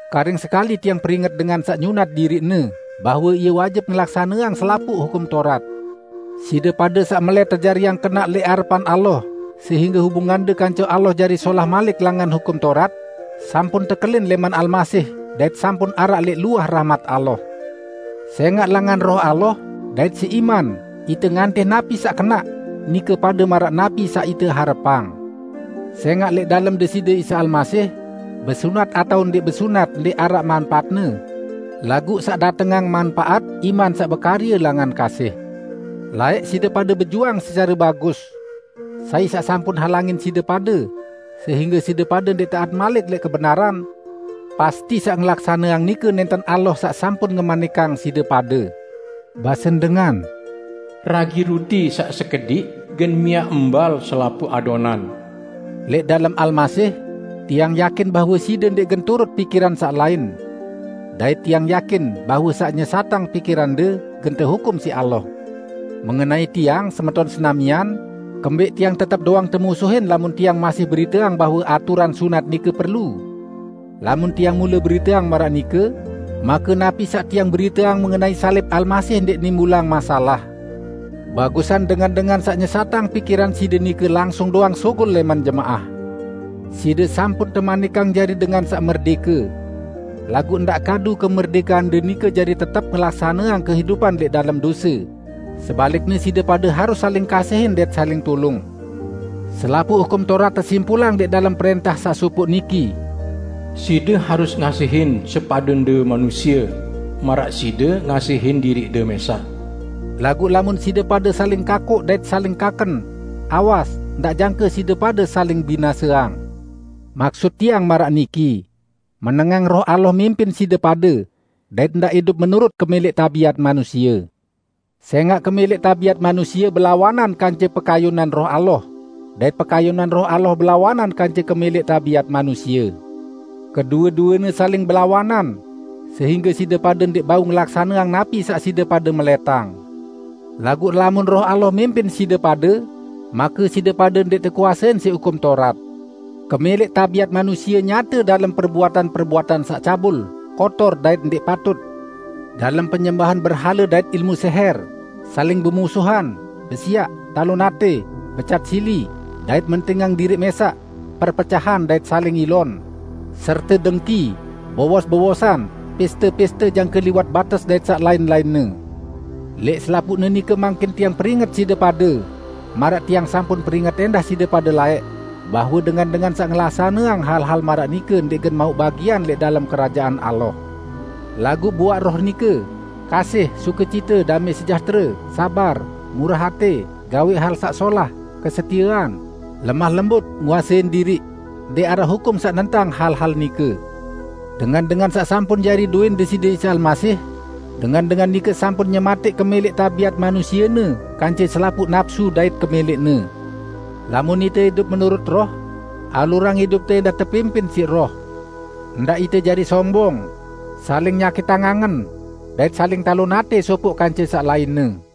Karing sekali tiang peringet dengan saq nyunat diriqne, bahwe ie wajib ngelaksaneang selapuq Hukum Taurat! Side pade, saq melẽt tejariang kenaq lẽq arepan Allah sehingge hubungande kance Allah jari solah malik langan Hukum Taurat, sampun tekelin lẽman Almasih dait sampun araq lẽq luah rahmat Allah. Sẽngaq langan Roh Allah dait siq iman, ite ngantih napi saq kenaq, nike pade maraq napi saq ite harepang. Sẽngaq lẽq dalem Deside Isa Almasih, besunat atao ndẽq besunat ndẽq araq manpaatne; laguq saq datengang manpaat, iman saq bekarye langan kasih. Laẽq side pade bejuang secare bagus. Sai saq sampun halangin side pade sehingge side pade ndẽq taat malik lẽq kebenaran? Pasti saq ngelaksaneang nike nẽnten Allah saq sampun ngemanikang side pade! Basen dengan, "Ragi ruti saq sekediq gen miaq mbal selapuq adonan." Lẽq dalem Almasih, tiang yakin bahwe side ndẽq gen turut pikiran saq lain. Dait tiang yakin bahwe saq nyesatang pikirande, gen tehukum siq Allah. Mengenai tiang, semeton senamian, kembẽq tiang tetep doang temusuhin lamun tiang masih beriteang bahwe aturan sunat nike perlu? Lamun tiang mule beriteang maraq nike, make napi saq tiang beriteang mengenai salib Almasih ndẽq nimbulang masalah. Bagusan dengan-dengan saq nyesatang pikiran side nike langsung doang sugul lẽman jemaah! Side sampun temanikang jari dengan saq merdẽke. Laguq ndaq kadu kemerdẽkeande nike jari tetep ngelaksaneang kehidupan lẽq dalem dose, sebalikne side pade harus saling kasihin dait saling tulung. Selapuq Hukum Taurat tesimpulang lẽq dalem prẽntah saq sopoq niki, "Side harus ngasihin sepadende manusie, maraq side ngasihin diriqde mẽsaq." Laguq lamun side pade saling kakoq dait saling kaken, awas, ndaq jangke side pade saling binaseang. Maksut tiang maraq niki: Menengang Roh Allah mimpin side pade, dait ndaq idup menurut kemẽlẽq tabiat manusie. Sẽngaq kemẽlẽq tabiat manusie belawanan kance pekayunan Roh Allah, dait pekayunan Roh Allah belawanan kance kemẽlẽq tabiat manusie. Kedue-duene saling belawanan, sehingge side pade ndẽq bau ngelaksaneang napi saq side pade melẽtang. Laguq lamun Roh Allah mimpin side pade, make side pade ndẽq tekuasein siq Hukum Taurat. Kemẽlẽq tabiat manusie nyate dalem perbuatan-perbuatan saq cabul, kotor dait ndẽq patut; dalem penyembahan berhale dait ilmu sẽhẽr; saling bemusuhan, besiaq, talon atẽ, becat sili, dait mentingang diriq mẽsaq, perpecahan dait saling ilon, serte dengki, bowos-bowosan, pẽste-pẽste jangke liwat bates dait saq lain-lainne. Lẽq selapuqne nike mangkin tiang peringet side pade maraq tiang sampun peringet ẽndah side pade laẽq, bahwe dengan-dengan saq ngelaksaneang hal-hal maraq nike ndẽq gen mauq bagian lẽq dalem Kerajaan Allah. Laguq buaq Roh nike: Kasih, sukecite, damẽ sejahtere, sabar, murah atẽ, gawẽq hal saq solah, kesetiean, lemah lembut, nguasein diriq. Ndẽq araq hukum saq nentang hal-hal nike. Dengan-dengan saq sampun jari dowẽn Deside Isa Almasih, dengan-dengan nike sampun nyematẽq kemẽlẽq tabiat manusiene kance selapuq napsu dait kemẽlẽqne. Lamun ite idup menurut Roh, alurang idupte ẽndah tepimpin siq Roh. Ndaq ite jari sombong, saling nyakitang angen, dait saling talon atẽ sopoq kance saq lainne.